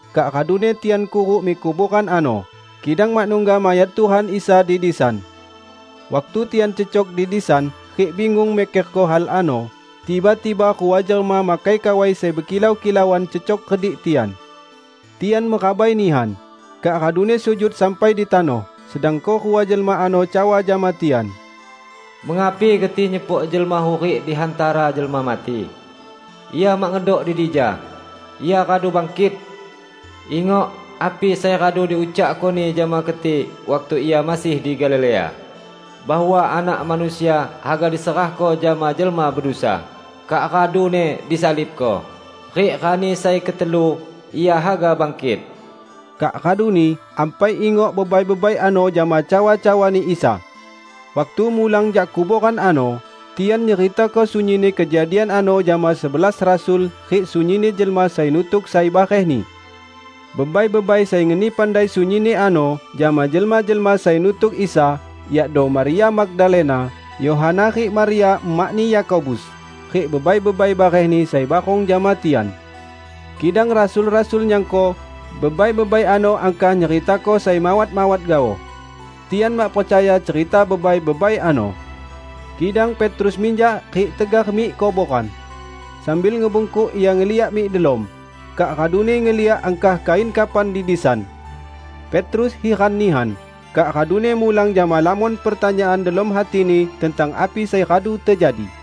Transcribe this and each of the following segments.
Kak raduni tian kuruk mik kuboran ano, kidang mak nungga mayat Tuhan Isa di disan. Waktu tian cecok di disan rik bingung mikerko hal ano, tiba-tiba rua jelma makai kawai sai bekilau-kilauan cecok redik tian. Tian merabai nihan, kak raduni sujud sampai di tanoh, sedangko rua jelma ano cawa jama tian, "Mengapi keti nyepok jelma hurik di hantara jelma mati? Ia mak ngedok di dija. Ia radu bangkit! Ingok api sai radu diucakko-Ni jama keti waktu Ia masih di Galilea, bahwa 'Anak Manusia haga diserahko jama jelma bedusa, kak raduni disalibko, rik rani sai ketelu Ia haga bangkit.' " Kak raduni ampai ingok bebai-bebai ano jama cawa-cawani Isa. Waktu mulang jak kuboran ano, tian nyeritako sunyinni kejadian ano jama sebelas rasul rik sunyinni jelma sai nutuk sai barehni. Bebai-bebai sai ngeni pandai sunyinni ano jama jelma-jelma sai nutuk Isa, yakdo: Maria Magdalena, Yohana rik Maria emakni Yakobus, rik bebai-bebai barehni sai barong jama tian. Kidang rasul-rasul nyangko bebai-bebai ano angkah nyeritako sai mawat-mawat gaoh. Tian mak percaya cerita bebai-bebai ano. Kidang Petrus minjak rik tegar mik kuboran. Sambil ngebungkuk ia ngeliak mik delom, kak raduni ngeliak angkah kain kafan di disan. Petrus hiran nihan, kak raduni mulang jama lamon pertanyaan delom hatini tentang api sai radu tejadi.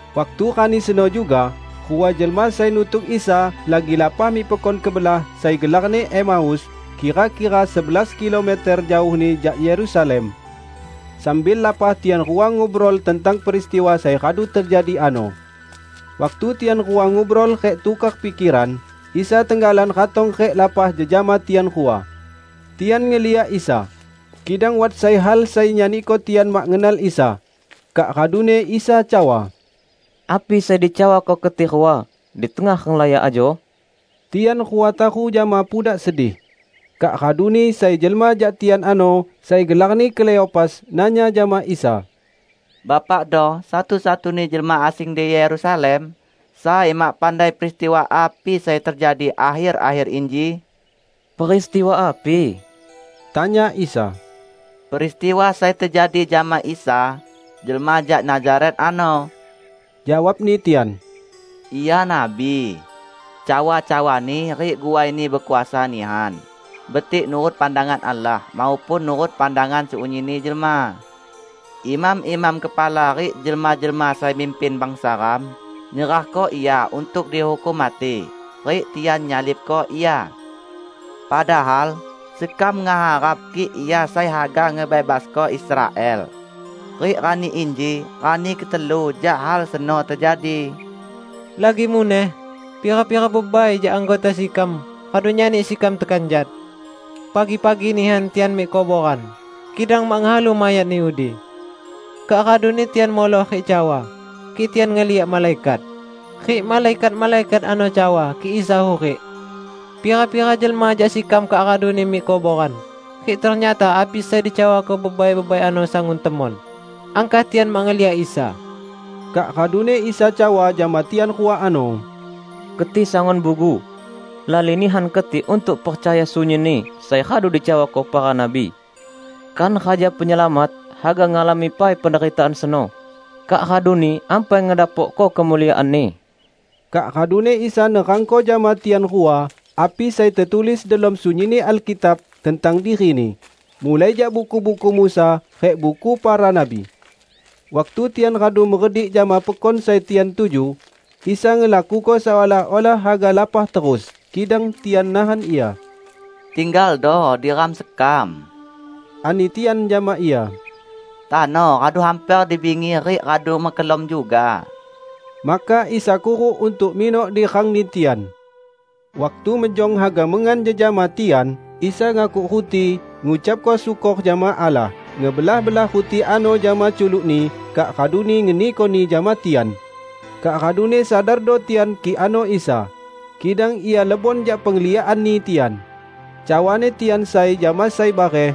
Waktu rani seno juga, rua jelma sai nutuk Isa lagi lapah mik pekon kebelah sai gelarni Emaus, kira-kira sebelas kilometer jaohni jak Yerusalem. Sambil lapah tian rua ngubrol tentang peristiwa sai radu tejadi ano. Waktu tian rua ngubrol rik tukor pikeran, Isa tenggalan ratong rik lapah jejama tian rua. Tian ngeliak Isa, kidang wat sai hal sai nyaniko tian mak ngenal Isa. Kak raduni Isa cawa, "Api sai dicawako keti rua di tengah renglaya ajo?" Tian rua taru jama pudak sedih. Kak raduni sai jelma jak tian ano, sai gelarni Kleopas, nanya jama Isa, "Bapakdo satu-satuni jelma asing di Yerusalem sai mak pandai peristiwa api sai tejadi akher-akher inji?" "Peristiwa api?" tanya Isa. "Peristiwa sai tejadi jama Isa, jelma jak Nazaret ano," jawabni tian. "Ia nabi. Cawa-cawa-Ni rik guai-Ni bekuasa nihan -- betik nurut pandangan Allah maupun nurut pandangan sunyinni jelma. Imam-imam kepala rik jelma-jelma sai mimpin bangsa ram nyerahko Ia untuk dihukum mati, rik tian nyalibko Ia! Padahal sekam ngeharap kik Ia sai haga ngebebasko Israel! Rik rani inji rani ketelu jak hal seno tejadi. Lagi muneh, pira-pira bebai jak anggota sekam radu nyani sekam tekanjat. Pagi-pagi nihan tian mik kuboran, kidang mak ngehalu mayat-Ni udi. Kak raduni tian muloh rik cawa kik tian ngeliak malaikat, rik malaikat-malaikat ano cawa kik Isa hurik. Pira-pira jelma jak sekam kak raduni mik kuboran rik ternyata api sai dicawako bebai-bebai ano sangun temon, angkah tian mak ngeliak Isa." Kak raduni Isa cawa jama tian rua ano, "Keti sangun bugu! Lali nihan keti untuk percaya sunyinni sai radu dicawako para nabi! Kan Raja Penyelamat haga ngalami pai penderitaan seno, kak raduni ampai ngedapokko kemuliaan-Ni?" Kak raduni Isa nerangko jama tian rua api sai tetulis delom sunyinni Alkitab tentang diri-Ni, mulai jak buku-buku Musa rik buku para nabi. Waktu tian radu meredik jama pekon sai tian tuju. Isa ngelakuko seolah-olah haga lapah terus, kidang tian nahan Ia, "Tinggaldo di rang sekam," ani tian jama Ia, "tano radu hamper di bingi rik radu mekelom juga." Maka Isa kuruk untuk minok di rangni tian. Waktu mejong haga mengan jejama tian, Isa ngakuk ruti, ngucapko syukor jama Allah, ngebelah-belah ruti ano jama culuk-Ni, kak raduni ngenikoni jama tian. Kak raduni sadardo tian kik ano Isa. Kidang Ia lebon jak pengliakanni tian. Cawani tian sai jama sai bareh,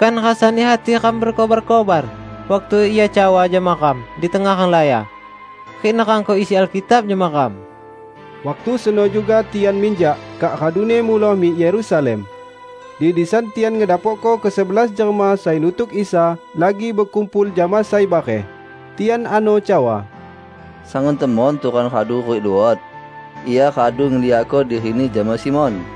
"Kan rasani hati ram bekobar-kobar, waktu Ia cawa jama ram di tengah renglaya, rik nerangko isi Alkitab jama ram?" Waktu seno juga tian minjak kak raduni muloh mik Yerusalem. Di disan tian ngedapokko kesebelas jelma sai nutuk Isa lagi bekumpul jama sai bareh. Tian ano cawa, "Sangun temon Tuhan radu hurik luot! Ia radu ngeliakko diri-Ni jama Simon!"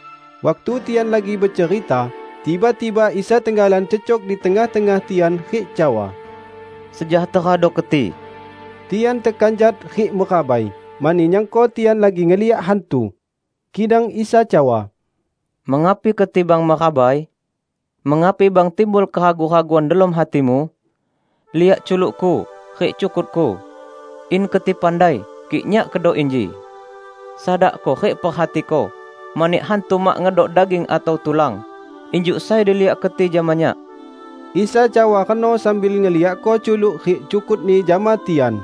Waktu tian lagi becerita, tiba-tiba Isa tenggalan cecok di tengah-tengah tian rik cawa, "Sejahterado keti!" Tian tekanjat rik merabai, mani nyangko tian lagi ngeliak hantu. Kidang Isa cawa, "Mengapi keti bang merabai? Mengapi bang timbul keragu-raguan delom hatimu? Liak culuk-Ku rik cukut-Ku. In keti pandai, kik Nyak kedo inji! Sadakdo rik perhatiko, mani hantu mak ngedok daging atau tulan, injuk sai diliak keti jama Nyak." Isa cawa reno sambil ngeliakko culuk rik cukut-Ni jama tian.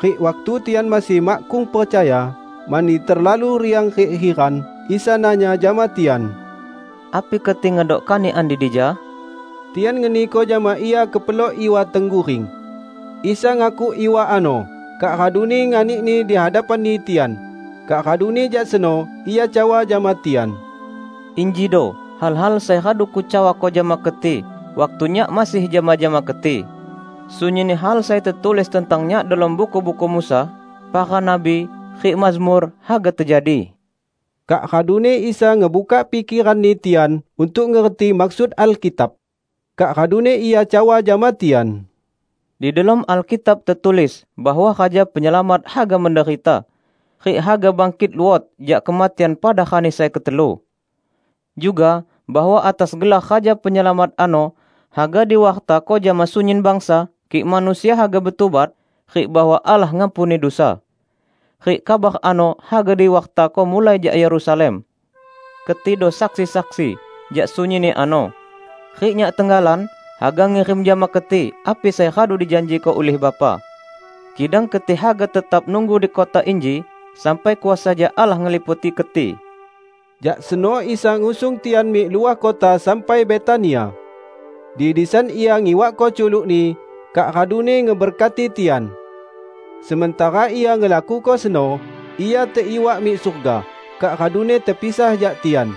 Rik waktu tian masih makkung percaya, mani terlalu riang rik hiran, Isa nanya jama tian, "Api keti ngedok kanikan di dija?" Tian ngeniko jama Ia kepelok iwa tengguring. Isa ngakuk iwa ano, kak raduni nganikni di hadapanni tian. Kak raduni jak seno Ia cawa jama tian, "Injido hal-hal sai radu Kucawako jama keti waktu Nyak masih jama-jama keti: sunyinni hal sai tetulis tentang Nyak delom Buku-buku Musa, Para Nabi, rik Mazmur, haga tejadi." Kak raduni Isa ngebukak pikeranni tian untuk ngerti maksud Alkitab. Kak raduni Ia cawa jama tian, "Di delom Alkitab tetulis bahwa Raja Penyelamat haga menderita, rik haga bangkit luot jak kematian pada rani sai ketelu. Juga bahwa atas gelar Raja Penyelamat ano haga diwartako jama sunyin bangsa kik manusia haga betubat, rik bahwa Allah ngampuni dusa. Rik kabar ano haga diwartako mulai jak Yerusalem. Ketido saksi-saksi jak sunyinni ano. Rik Nyak tenggalan haga ngirim jama keti api sai radu dijanjiko ulih Bapa. Kidang keti haga tetap nunggu di kota inji sampai kuasa jak Allah ngeliputi keti." Jak seno Isa ngusung tian mik luah kota sampai Betania. Di disan Ia ngiwakko culuk-Ni, kak raduni ngeberkati tian. Sementara Ia ngelakuko seno, Ia teiwak mik surga, kak raduni tepisah jak tian.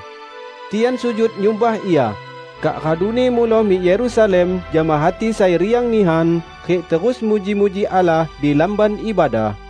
Tian sujud nyumbah Ia, kak raduni muloh mik Yerusalem jama hati sai riang nihan, rik terus muji-muji Allah di Lamban Ibadah.